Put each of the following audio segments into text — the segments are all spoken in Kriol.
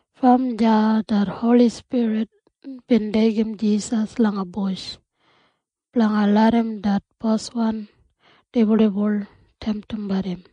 Brom deya det Holi Spirit bin deigim Jisas langa bush blanga larram det boswan dibuldibul temtimbat im.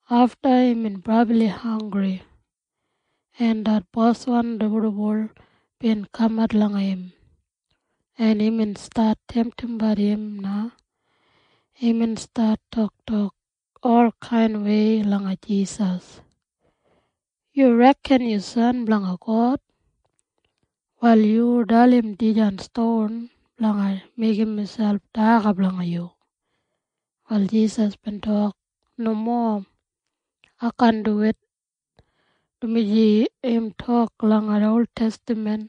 Afta imbin brabli hanggri, en det boswan dibuldibul bin kamat langa im, en imbin stat temtimbat im na. Imbin stat toktok olkainwei langa Jisas, “Yu reken yu San blanga God. Wal yu dalim dijan ston blanga meigim miselp daga blanga yu.” Wal Jisas bin tok, “Nomo. Ai kaan duwit, dumaji im tok langa oltestaman,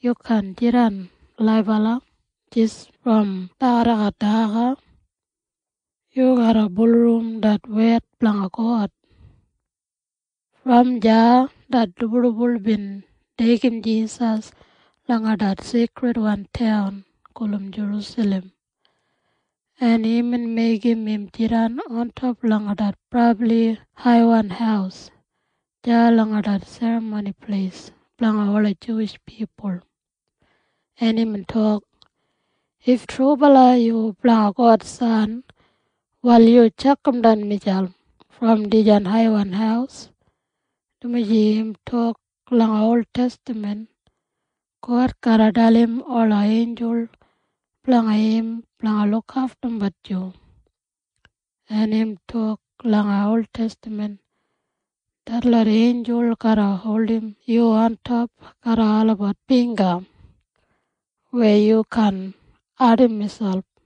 ‘Yu kaan jidan laibala jis brom dagadagat daga. Yu garra bulurrum det wed blanga God.’” Brom deya det dibuldibul bin deigim Jisas langa det seikridwan taun gulum Jerusalem, en imbin meigim im jidan ontop langa det brabli haiwan haus deya langa det Serramoni Pleis blanga ola Juwish pipul, en imbin tok, “If trubala yu blanga God San, wal yu tjakamdan miselp brom dijan haiwan haus, dumaji im tok langa oltestaman, ‘God garra dalim ola einjul blanga im blanga lukaftumbat yu.’ En im tok langa oltestaman, ‘Detlot einjul garra holdim yu ontop garram olabat bingga weya yu kaan ardim miselp.’”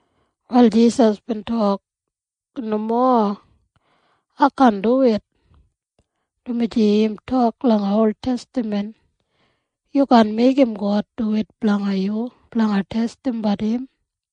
Wal Jisas bin tok, “Nomo. Ai kaan duwit, dumaji im tok langa oltestaman, ‘Yu kaan meigim God duwit langa yu blanga testimbat im.’”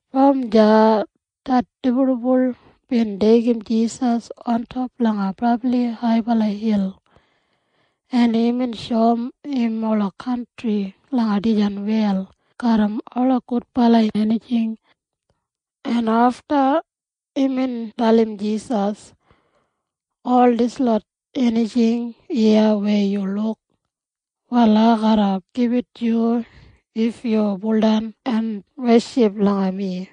Brom deya det dibuldibul bin deigim Jisas ontop langa brabli haibala hil, en imbin shoum im ola kantri langa dijan wel garram ola gudbala enijing, en afta imbin dalim Jisas, “Ol dislot enijing iya weya yu luk, wal ai garra gibit yu if yu baudan en weship langa mi.”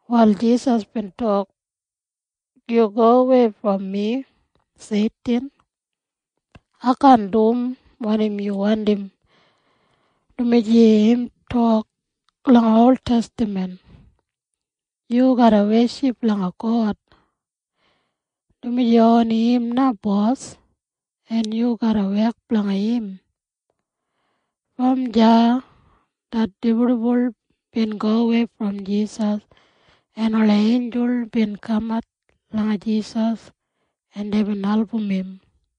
Wal Jisas bin tok, “Yu gowei brom mi, Seitin. Ai kaan dum wanim yu wandim, dumaji im tok langa oltestaman, ‘Yu garra weship langa God, dumaji oni im na Bos, en yu garra wek blanga im.’” Brom deya det dibuldibul bin gowei brom Jisas, en ola einjul bin kaman langa Jisas, en deibin album im.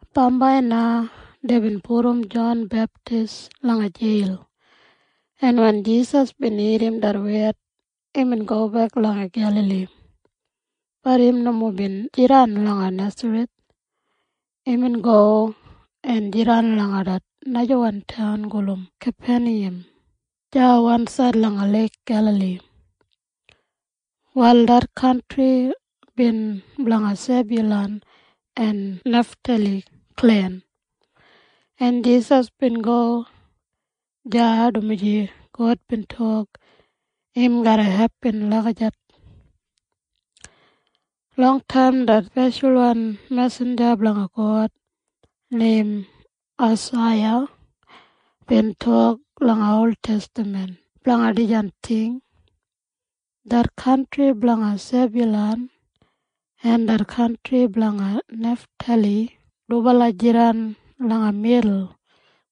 Bambai na deibin pudum Jon Beptis langa jeil, en wen Jisas bin irrim det wed, imbin gobek langa Gelali. Bat im nomo bin jidan langa Nesareth. Imbin go en jidan langa det najawan taun gulum Kapeniyam deya wansaid langa Leik Gelali. Wal det kantri bin blanga Sebyulan en Neftali klen, en Jisas bin go deya dumaji God bin tok im garra hepin lagijat. Longtaim det speshalwan mesinja blanga God neim Aisaiya bin tok langa oltestaman blanga dijan ting, “Det kantri blanga Sebyulan en det kantri blanga Neftali dubala jidan langa midul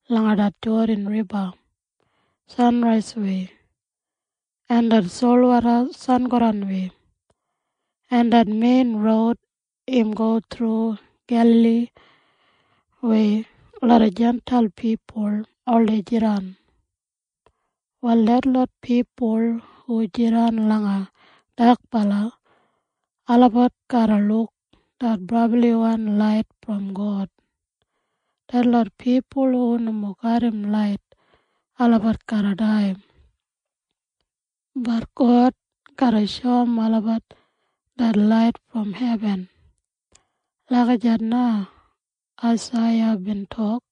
langa det Jodan Riba sanraiswei en det solwoda sangodanwei, en det mein roud im go thru Gelali weya loda Jintail pipul oldei jidan. Wal detlot pipul hu jidan langa dakbala, olabat garra luk det brabliwan lait brom God. Detlot pipul hu nomo garram lait, olabat garra dai. Bat God garra shoum olabat det lait brom hebin.” Lagijat na Aisaiya bin tok.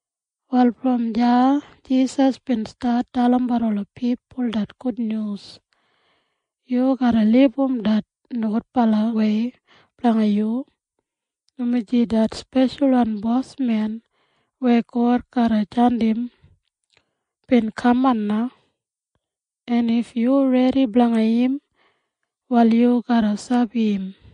Wal brom deya Jisas bin stat dalimbat ola pipul det gudnyus, “Yu garra libum det nogudbalawei blanga yu, dumaji det speshalwan Bosmen weya God garra jandim, bin kaman na, en if yu redi blanga im, wal yu garra sabi im.”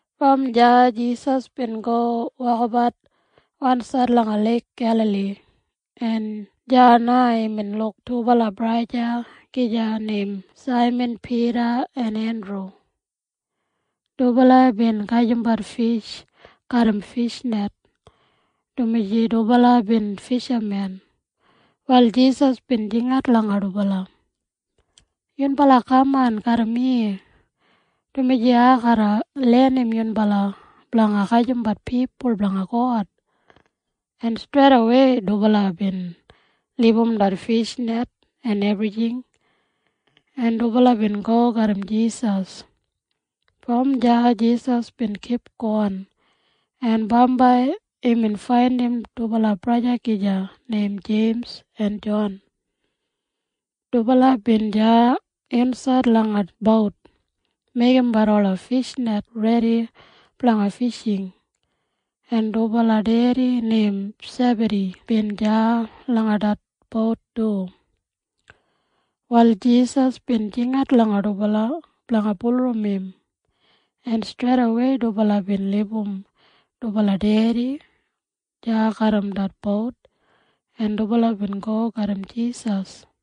Brom deya Jisas bin go wokabat wansaid langa Leik Gelali, en deya na imbin luk dubala braja gija neim Saiman Pida en Endru. Dubala bin gajimbat fish garram fishnet, dumaji dubala bin fishamen. Wal Jisas bin jingat langa dubala, “Yunbala kaman garram mi, dumaji ai garra lenim yunbala blanga gajimbat pipul blanga God.” En streidawei dubala bin libum det fishnet en ebrijing, en dubala bin go garram Jisas. Brom deya Jisas bin kipgon, en bambai imbin faindim dubala braja gija neim Jeims en Jon. Dubala bin deya insaid langa bout meigimbat ola fishnet redi blanga fishing, en dubala dedi neim Sebadi bin deya langa det bout du. Wal Jisas bin jingat langa dubala blanga bulurrum im, en streidawei dubala bin libum dubala dedi deya garram det bout, en dubala bin go garram Jisas.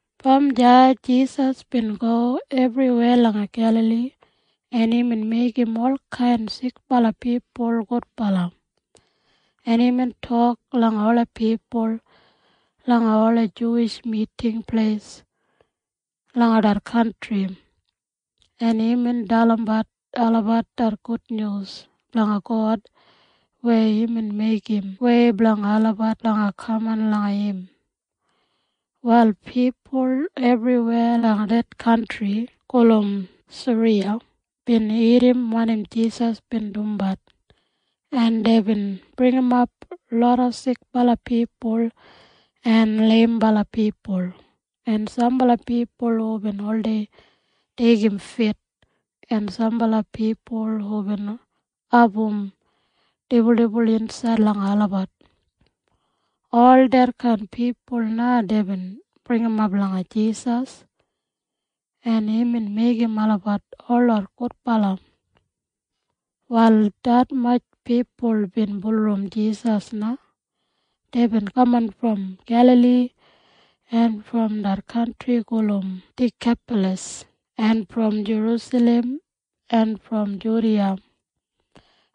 Brom deya Jisas bin go ebriweya langa Gelali, en imbin meigim olkain sikbala pipul gudbala, en imbin tok langa ola pipul langa ola Juwish Miting Pleis langa det kantri, en imbin dalimbat olabat det gudnyus blanga God weya imbin meigim wei blanga olabat blanga kaman langa im. Wal pipul ebriweya langa det kantri gulum Siriya bin irrim wanim Jisas bin dumbat, en deibin bringimap loda sikbala pipul en leimbala pipul en sambala pipul hubin oldei deigim fit en sambala pipul hubin abum dibuldibul insaid langa olabat. Ol detkain pipul na deibin bringimap langa Jisas, en imbin meigim olabat holot gudbala. Wal detmatj pipul bin bulurrum Jisas na. Deibin kaman brom Gelali en brom det kantri gulum Dikapalas en brom Jerusalem en brom Judiya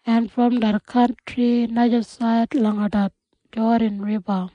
en brom det kantri najasaid langa det Jodan Riba.